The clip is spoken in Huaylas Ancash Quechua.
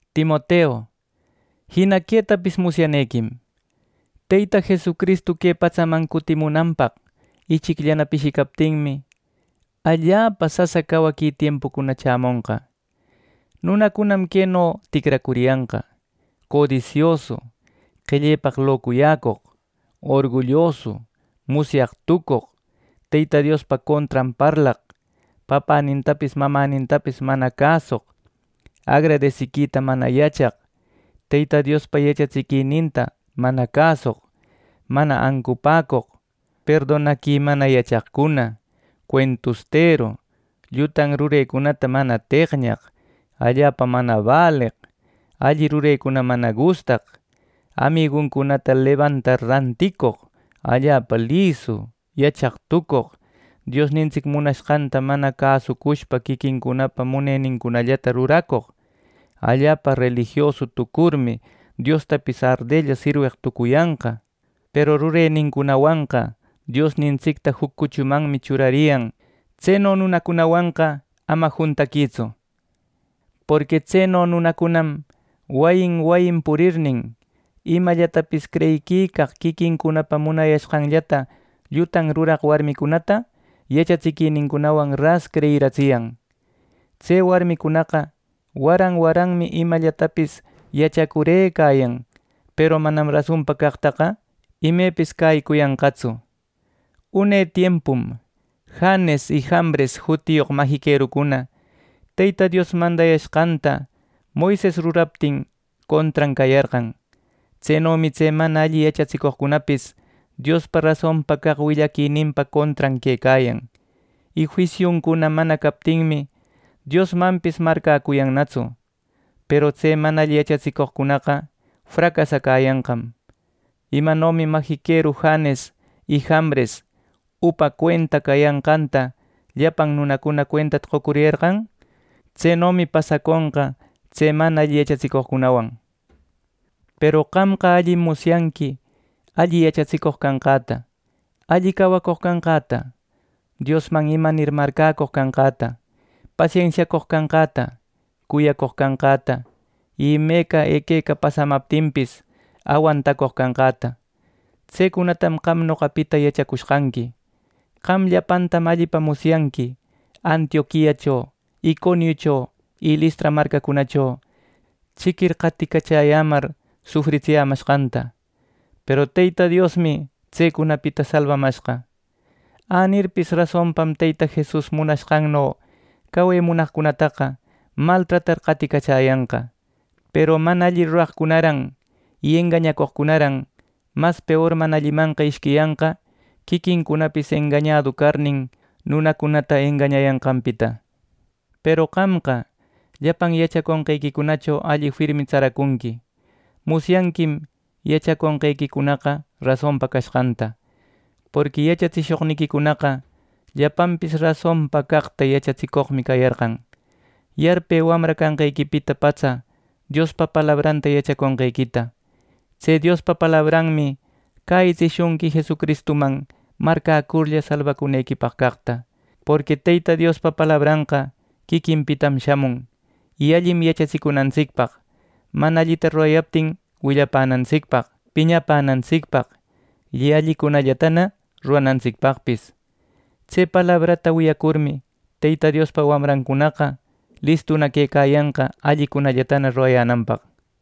Timoteu, jina quetapis musyanequim: Teyta Jesucristu que patsaman cutimunanpaq ichicllana pishicaptinmi, allapa sasa cawaqui tiempucuna chämonqa. Nunacunam queno ticracuriyanqa: codisiosu, qellellapaq locuyäcoq, orgullosu, musyaq tucoq, Teyta Diospa contran parlaq, papänintapis mamantapis mana cäsoq, agradesiquita mana yachaq, Teyta Diospa yachatsiquininta mana cäsoq, mana ancupäcoq, perdonaqui mana yachaqcuna, cuentusteru, llutan rurecunata mana teqñaq, allapa mana baleq, alli rurecuna mana gustaq, amiguncunata lebantar ranticoq, allapa lisu, yachaq tucoq, Diosnintsic munashqanta mana cäsushpa quiquincunapa munenincunallata ruracoq. Allapa relijiosu tucurmi, Diostapis ardella sirweq tucuyanqa; peru rurenincunawanqa Diosnintsicta juc cuchumanmi churariyan. Tseno nunacunawanqa ama juntaquïtsu. Porqui tseno nunacunam wayin wayin purirnin, imallatapis creyiquicaq, quiquincunapa munayashqanllata llutan ruraq warmicunata yachatsiquinincunawan ras creyiratsiyan. Tse warmicunaqa waran waranmi imallatapis yachacurëcayan, peru manam rasonpa caqtaqa imepis cäyicuyanqatsu. Une tiempum Janes y Jambres jutiyoq majiquerucuna, Teyta Dios mandashqanta Moises ruraptin contran cayarqan. Tsenomi tse mana alli yachatsicoqcunapis Diospa rasonpa caq willaquininpa contran quecayan; y juisiuncuna mana captinmi, Diosmanpis marcäcuyannatsu. Peru tse mana alli yachatsicoqcunaqa fracasayanqam. Imanomi majiqueru Janes y Jambres upa cuenta cayanqanta, llapan nunacuna cuentata qocuriyarqan. Tsenomi pasaconqa tse mana alli yachatsicoqcunawan. Peru qamqa allim musyanqui: alli yachatsicoq canqäta, alli cawacoq canqäta, Diosman imanir marcäcoq canqäta, pasensiacoq canqäta, cuyacoq canqäta y imeca equeca pasamaptinpis awantacoq canqäta. Tsecunatam qam noqapita yachacushqanqui. Qam llapantam allipa musyanqui Antioquiacho, Iconiucho y Listra marcacunacho chiquir qaticachäyämar sufritsiyämashqanta, peru Teyta Diosmi tsecunapita salbamashqa. Änirpis, rasonpam Teyta Jesus munanqanno cawe munaqcunataqa maltratar qaticachäyanqa. Peru mana alli ruraqcunaran y engañacoqcunaran mas peor mana allimanqa ishquiyanqa, quiquincunapis engañadu carnin, nunacunata engañayanqanpita. Peru qamqa llapan yachaconqequicho alli firmi tsaracunqui. Musyanquim yachaconqequicunaqa rasonpa cashqanta. Porqui yachatsishoqniquicunaqa llapanpis rasonpa caqta yachatsicoqmi cayarqan. Yarpë wamra canqequipita patsa Diospa palabranta yachaconqequita. Tse Diospa palabranmi cäyitsishunqui Jesucristuman marcäcurlla salbacunequipaq caqta. Porqui Teyta Diospa palabranqa quiquinpitam shamun, y allim yachatsicunantsicpaq, mana allita rurayaptin willapänantsicpaq, piñapänantsicpaq y allicunallatana ruranantsicpaqpis. Tse palabrata wiyacurmi, Teyta Diospa wamrancunaqa listuna quecayanqa allicunallatana rurayänanpaq.